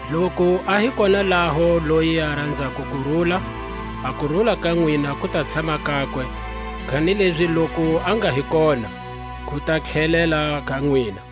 Loku a hi kona laho loyi a ranzako kurula, a kurula ka nwina ku ta tshama kakwe; kanilezi loku a nga hi koha, ku ta tlhelela ka nwina.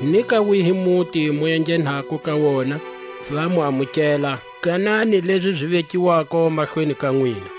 Ni ka wihi muti mu enghenako ka wona, va mu amukela, ganani lezi zi vekiwako mahlweni ka nwina;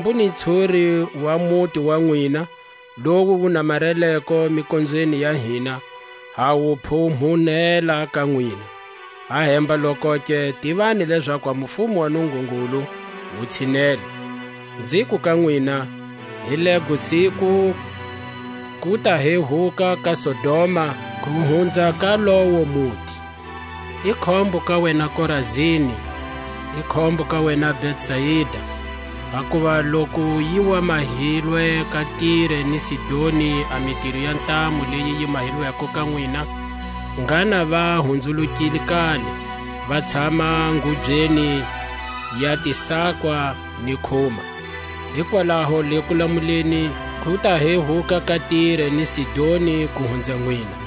Hambu ni ntshuri wa muti wa nwina, lowu wu namareleko mikonzweni ya hina, ha wu phumunhela ka nwina; ahemba-lokoke, tivani lezaku a mufumo wa Nungungulu wu tshinele. Nziku ka nwina: Hi lego siku ku ta hehuka ka Sodoma, ku hunza ka lowo muti. I khombo ka wena Korazini! I khombo ka wena Betsaida! Hakuva loku yi wa mahilwe ka Tire ni Sidoni a mitiro ya ntamu leyi yi mahilweko ka nwina, ngha na va hunzulukile kale, va tshama ngubyeni ya tisakwa ni khuma, Hikwalaho le kulamuleni ku ta hehuka ka Tire ni Sidoni ku hunza nwina,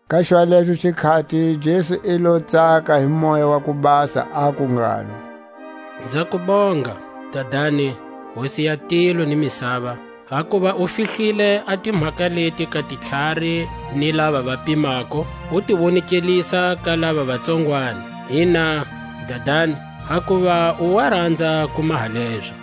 Ka xwalexo xikhati Jesu i lo tsaka hi Moya wa ku Basa, aku ngalo: Nza ku bonga, Dadani, Hosi ya tilo ni misava, hakuva u fihlile a timhaka leti ka titlhari ni lava va pimako, u ti wonekelisa ka lava va tsongwani; Ina, Dadani, hakuva u wa ranza ku maha lezo.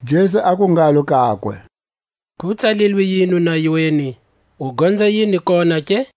Jesu aku ngalo kakwe: Ku tsalilwe yini nayweni, u gonza yini kona ke?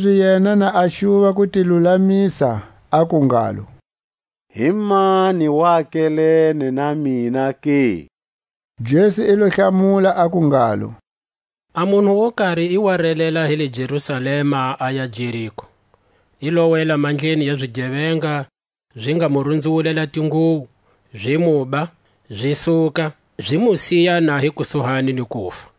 Kanilezi yena na a xuva ku ti lulamisa, aku ngalo: Himani wakelene na mina ke? Jesu i lo hlamula, aku ngalo: A munhu wo kari i wa relela hi le Jerusalema, aya Jeriko; i lo wela mandleni ya zigevenga, zi nga mu runzuwulela tinguwo, zi muba, zi suka, zi mu siya na hi kusuhani ni kufa.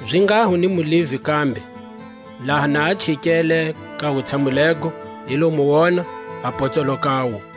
Zinghaho ni muLevi kambe; laha na a chikele ka wutshamu lego, i lo mu wona, a potsoloka wu.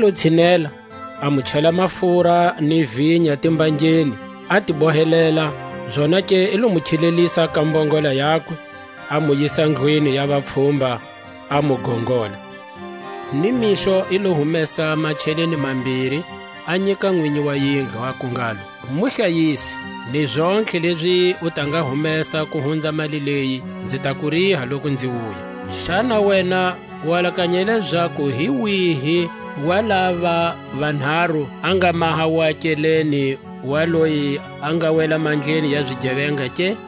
I lo tshinela, a mu chela mafura ni vinya timbangeni, a ti bohelela; zonake i lo mu khilelisa ka mbongola yakwe, a mu yisa ndlwini ya vapfhumba, a mu gongola. Ni mixo i lo humesa macheleni mambiri, a nyika nwinyi wa yindlu, aku ngalo: Mu hlayise, ni zontlhe lezi u ta nga humesa ku hunza mali leyi, nzi ta ku riha loku nzi wuya. Xana wena u alakanya lezaku hi wihi wa lava vanharu a nga maha wakelene wa loyi a nga wela mandleni ya zigevenga ke?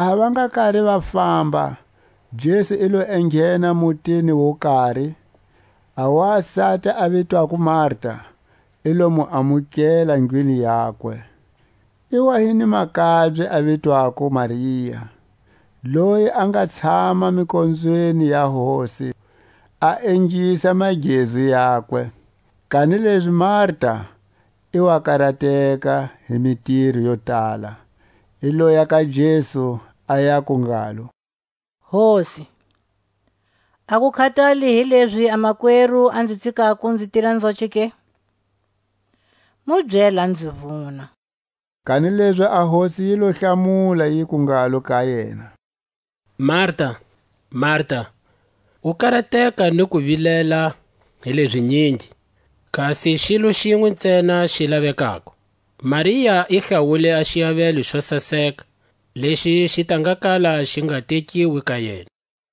Laha va nga kari va famba, Jesu i lo enghena mutini wo kari; a wasati a vitwako Marta i lo mu amukela ndlwini yakwe. I wa hi ni makabye a vitwako Maria, loyi a nga tshama mikonzweni ya Hosi, a ingisa magezu yakwe, kanilezi Maria i wa karateka hi mitiro yo tala. I loya ka Jesu, a yaku ngalo: Hosi, a ku khatali hi lezi a makweru a nzi tsikako nzi tira nzoce ke? Mu byele a nzi vuna. Kanilezi a Hosi yi lo hlamula, yiku ngalo ka yena: Marta, Maria, u karateka ni ku vilela hi leʼzinyingi, kasi xilo xinwe ntsena xi lavekako. Maria i hlawule a xiavelo xo saseka, lexi xi ta nga kala xi nga tekiwi ka yena.